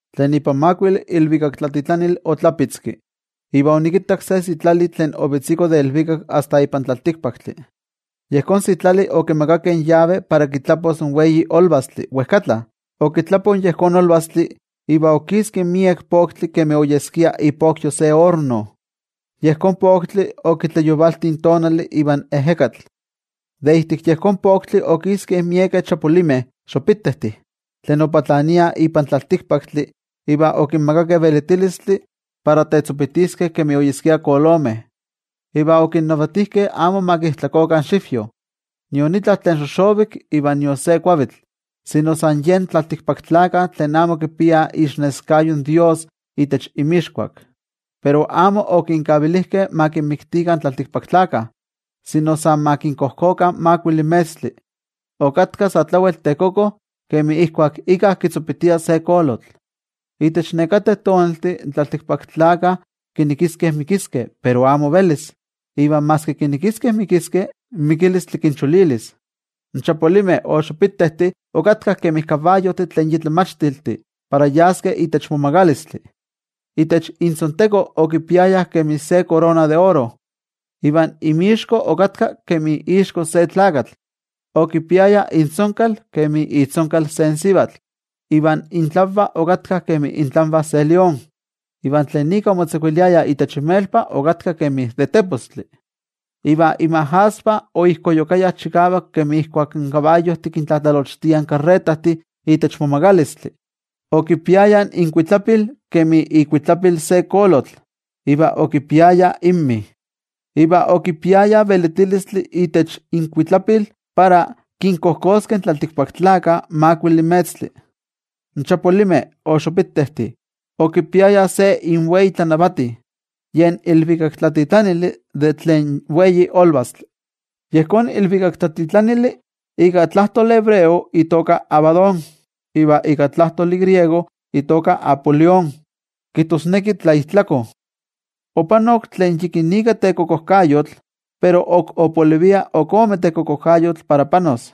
Tlen ipan makuili ilvikaktlatitlanili otlapitzki, iva onikittak se sitlali tlen ovetziko de ilvikak asta ipan tlaltikpaktli. Yejón sitlali okimakakeh in yave para kitlapos in wei olvastli wejkatla. Okitlapo yejón olvastli, iva okiski miek poktli kemi oyeskia ipokyo se orno. Yejón poktli okitlayovalti in tonali ivan ejekatl. De ijtik yejón poktli okiskeh miekeh chapulimeh tlen opatlaniah ipan tlaltikpaktli, iva okinmakakeh velitilistli para tetzopitiskeh kemi oyeskia kolomeh. Iva okinnavatijkeh amo ma kijtlakokah in xivyo, nion itla tlen xoxovik iva nion se kuavitl, sino san yen tlaltikpaktlakah tlen amo kipiah iixneskayo in toYejwatzi itech inmixkuak. Pero amo okinkavilijkeh ma kinmiktikah in tlaltikpaktlakah, sino san ma kinkojkokah makuili metztli. Okatka sa tlawel tekoko kemi ijkuak íkka kitzopitia se kolotl. Itech nekateh tonaltih in tlaltikpaktlakah kinekiskeh mikiskeh pero amo velis. Iva maski kinekiskeh mikiskeh, in mikilistli kincholilis. In chapulimeh okatkah kemi kabayojtih tlen yi tlamachtiltih para yaskeh itech momagalistli. Itech intzonteko okipiayah kemi se korona de oro, iva inmixko okatka kemi ixko se tlakatl. Okipiayah intzonkal kemi itzonkal se sivatl, iva intlanvah okatka kemi itlanvah se lión. Iva tlen ika omotzakuiliayah itech inmelpa okatka kemi de tepostli. Iva inmajasvah oijkoyukayah chikavak kemi ijkuak in kabayojtih kintlatlalochtiah in karretajtih itech momagalistli. Okipiayah inkuitlapil kemi ikuitlapil se kolotl iva okipiayah inmi. Iva okipiayah velitilistli itech inkuitlapil para kinkojkoskeh in tlaltikpaktlakah makuili metztli. In chapulimeh okipiayah se inwei tlanavati, yen ilvikaktlatitlanili de tlen wei olvastli. Yejón ilvikaktlatitlanili ika tlajtoli hebreo itoka Abadón, iva ika tlajtoli griego itoka Apolión, kijtosneki tlaijtlako. Opanok tlen yikinika tekokojkayotl, pero ok opolivia ok ome tekokojkayotl para panos.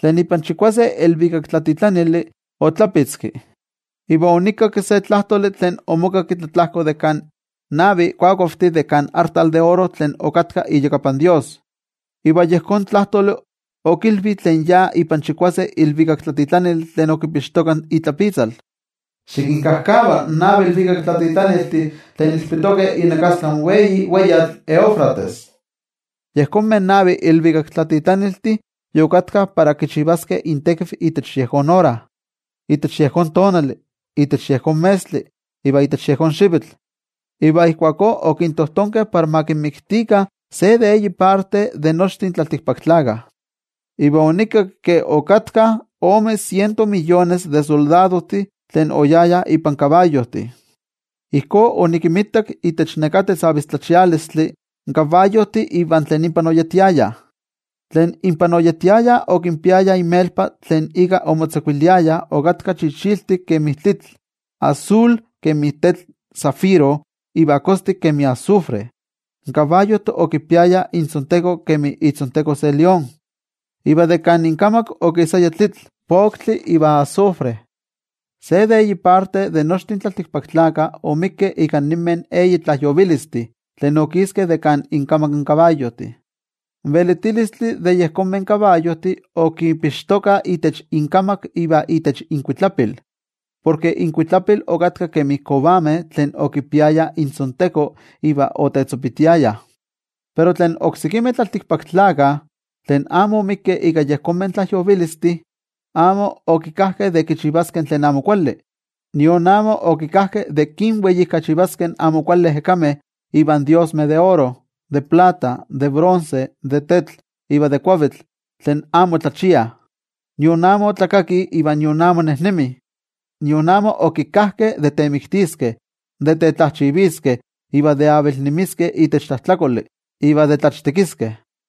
Tlen ipan chikuase ilvikaktlatitlanili otlapitzki, iva onikakki se tlajtoli tlen omokakki tlatlajko de kan navi kuakuavtih de kan artal de oro tlen okatka iyakapan Dios. Iva yejón tlajtoli okilvi tlen ya ipan chikuase ilvikaktlatitlanili tlen okipixtoka itlapitzal: —Xikinkajkava in navi ilvikaktlatitlaniltih tlen ilpitokeh inakastlan wei weyatl Eufrates. Yejonmeh navi ilvikaktlatitlaniltih yokatkah para kichivaskeh intekiv itech yejón ora, itech yejón tonali, itech yejón metztli iva itech yejón xivitl, iva ijkuakó okintojtonkeh para ma kinmiktikah se de eyi parte de nochtin tlaltikpaktlakah. Iva onikakki ke okatkah ome siento miyones de soldadojtih tlen oyayah ipan kabayojtih. Ijkó onikinmitak itech neká tetzavistlachialistli, in kabayojtih iva tlen inpah oyetiayah. Tlen inpah oyetiayah okipiayah inmelpa tlen ika omotzakuiliayah okatka chichiltik kemi tlitl, asul kemi tetl zafiro iva kostik kemi azufre. In kabayojtih okipiayah intzonteko kemi itzonteko se lión, iva de kan inkamak okisaya tlitl, poktli iva azufre. Se de eyi parte de nochtin tlaltikpaktlakah omikkeh ika ninmeh eyi tlajyovilistih tlen okiskeh de kan inkamak in kabayojtih. In velitilistli de yejonmeh kabayojtih okipixtokah itech inkamak iva itech inkuitlapil, porke inkuitlapil okatkah kemi kovameh tlen okipiayah intzonteko iva otetzopitiayah. Pero tlen oksekimeh tlaltikpaktlakah, tlen amo omikkeh ika yejonmeh tlajyovilistih, amo okikajkeh de kichivaskeh tlen amo kuali, nion amo okajkeh de kinweijkachivaskeh in amo kuali ejekameh ivan diosmeh de oro, de plata, de bronce, de tetl iva de kuavitl, tlen amo tlachiah, nion amo tlakakih iva nion amo nejnemih. Nion amo okikajkeh de temiktiskeh, de tetlajchiviskeh, de avilnemiskeh itech tlajtlakoli, iva de tlachtekiskeh.